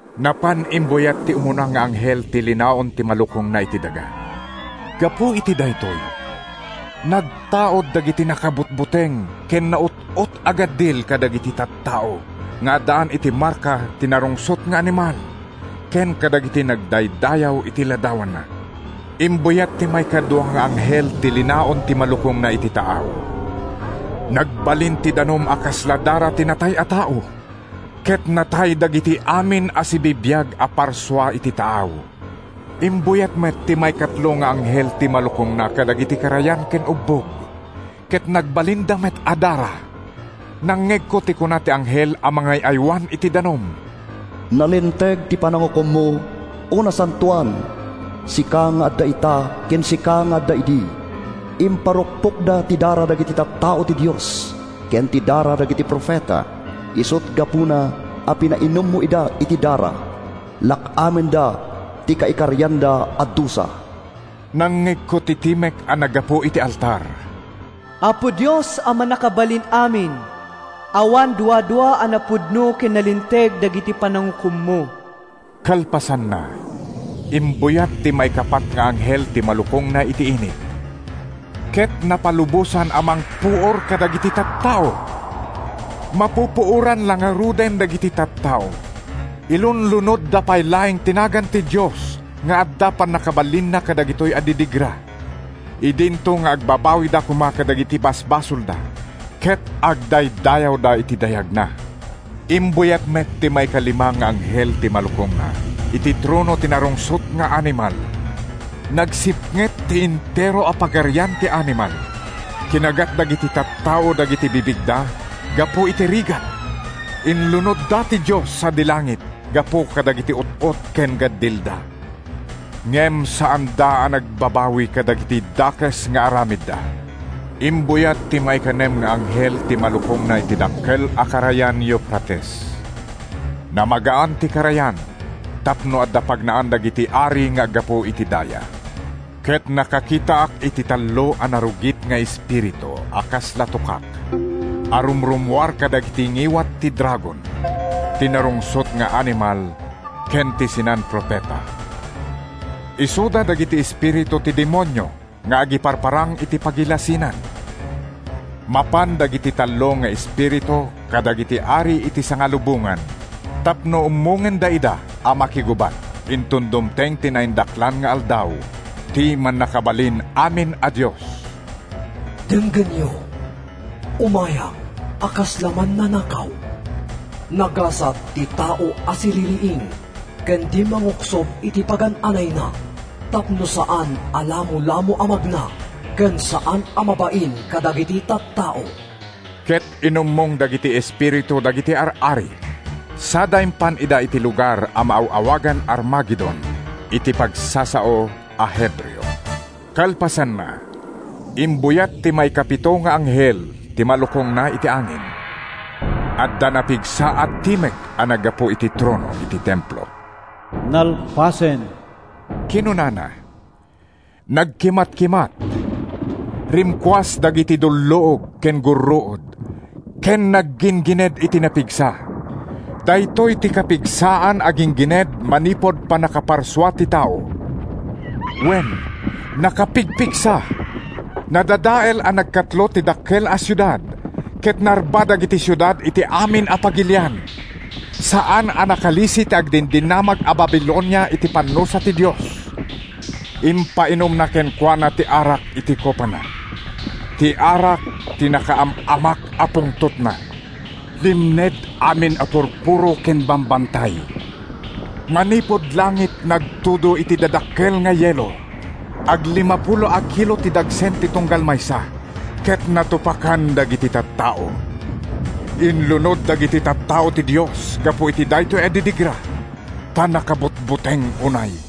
Napan imbuyat ti umuna nga anghel ti linaon ti malukongna iti daga. Gapu iti daytoy, nagtaud dagiti nakabutbuteng ken naut-ot a gaddil kadagiti tattao nga addaan iti marka ti narungsot nga animal, ken kadagiti nagdaydayaw iti ladawanna. Imbuyat ti maikadua nga anghel ti linaon ti malukongna iti taaw. Nagbalin ti danum a kasla dara ti natay a tao ket natay dagiti amin a sibibiag a parsua iti taaw. Imbuyat met ti maikatlo nga anghel ti malukongna kadagiti karayan ken ubbog, ket nagbalinda met a dara. Nangngegko ti kuna ti anghel a mangay-aywan iti danum: “Nalinteg ti panangukommo, O Nasantoan, Sika nga adda ita ken sika nga adda idi; Imparukpokda ti dara dagiti tattao ti Dios, Ken ti dara dagiti profeta, Isut’ gapuna a pinainummo ida iti dara. Lak-amenda ti kaikarianda a dusa.” Nangngegko ti timek a naggapu iti altar: “Apo Dios a Mannakabalin-amin, awan duadua a napudno ken nalinteg dagiti panangukommo!” Kalpasanna, imbuyat ti maikapat nga anghel ti malukongna iti init, ket napalubosan a mangpuor kadagiti tattao. Mapupuoran la ngaruden dagiti tattao, ilunlunodda pay laeng ti nagan ti Dios nga adda pannakabalinna kadagitoy a didigra idinto nga agbabawida koma kadagiti basbasolda ket agdaydayawda iti dayagna. Imbuyat met ti maikalima nga anghel ti malukongna iti trono ti narungsot nga animal. Nagsipnget ti entero a pagarian ti animal. Kinagat dagiti tattao dagiti bibigda gapu iti rigat. Inlunodda ti Dios sadi langit gapu kadagiti ut-ot ken gaddilda. Ngem saanda a nagbabawi kadagiti dakes nga aramidda. Imbuyat ti maikanem nga anghel ti malukongna iti dakkel a karayan Eufrates. Namagaan ti karayan tapno adda pagnaan dagiti ari nga aggapu iti daya. Ket nakakitaak iti tallo a narugit nga espiritu a kasla tukak a rumrummuar kadagiti ngiwat ti dragon, ti narungsot nga animal ken ti sinan-profeta. Isuda dagiti espiritu ti demonio nga agiparparang iti pagilasinan. Mapan dagiti tallo nga espiritu kadagiti ari iti sangalubongan tapno ummongenda ida a makigubat inton dumteng ti naindaklan nga aldaw ti Mannakabalin-amin a Dios. “Denggenyo, umayak a kasla mannanakaw! Nagasat ti tao a siririing ken di manguksob iti pagan-anayna tapno saan a lamolamo a magna ken saan a mabain kadagiti tattao.” Ket inummong dagiti espiritu dagiti ar-ari sada impan ida iti lugar a maaw-awagan Armagedon iti pagsasao a Hebreo. Kalpasanna, imbuyat ti maikapito nga anghel ti malukongna iti angin. Adda napigsa a timek a naggapu iti trono iti templo. “Nalpasen!” kinunana. Nagkimatkimat, rimkuas dagiti dulluog ken gurruod ken nagginggined iti napigsa. Daytoy ti kapigsaan a ginggined manipud pannakaparsua ti tao. Wen, nakapigpigsa! Nadadael a nagkatlo ti dakkel a siudad, ket narba dagiti siudad iti amin a pagilian. Saan a nakalisi ti agdindinamag a Babilonia iti pannusa ti Dios; impainumna kenkuana ti arak iti kopana—ti arak ti nakaam-amak a pungtotna. Limned amin a purpuro ken bambantay. Manipud langit, nagtudo iti dadakkel nga yelo—aglimapulo a kilo ti dagsen ti tunggal maysa—ket natupakan dagiti tattao. Inlunod dagiti tattao ti Dios gapu iti daytoy a didigra, ta nakabutbuteng unay.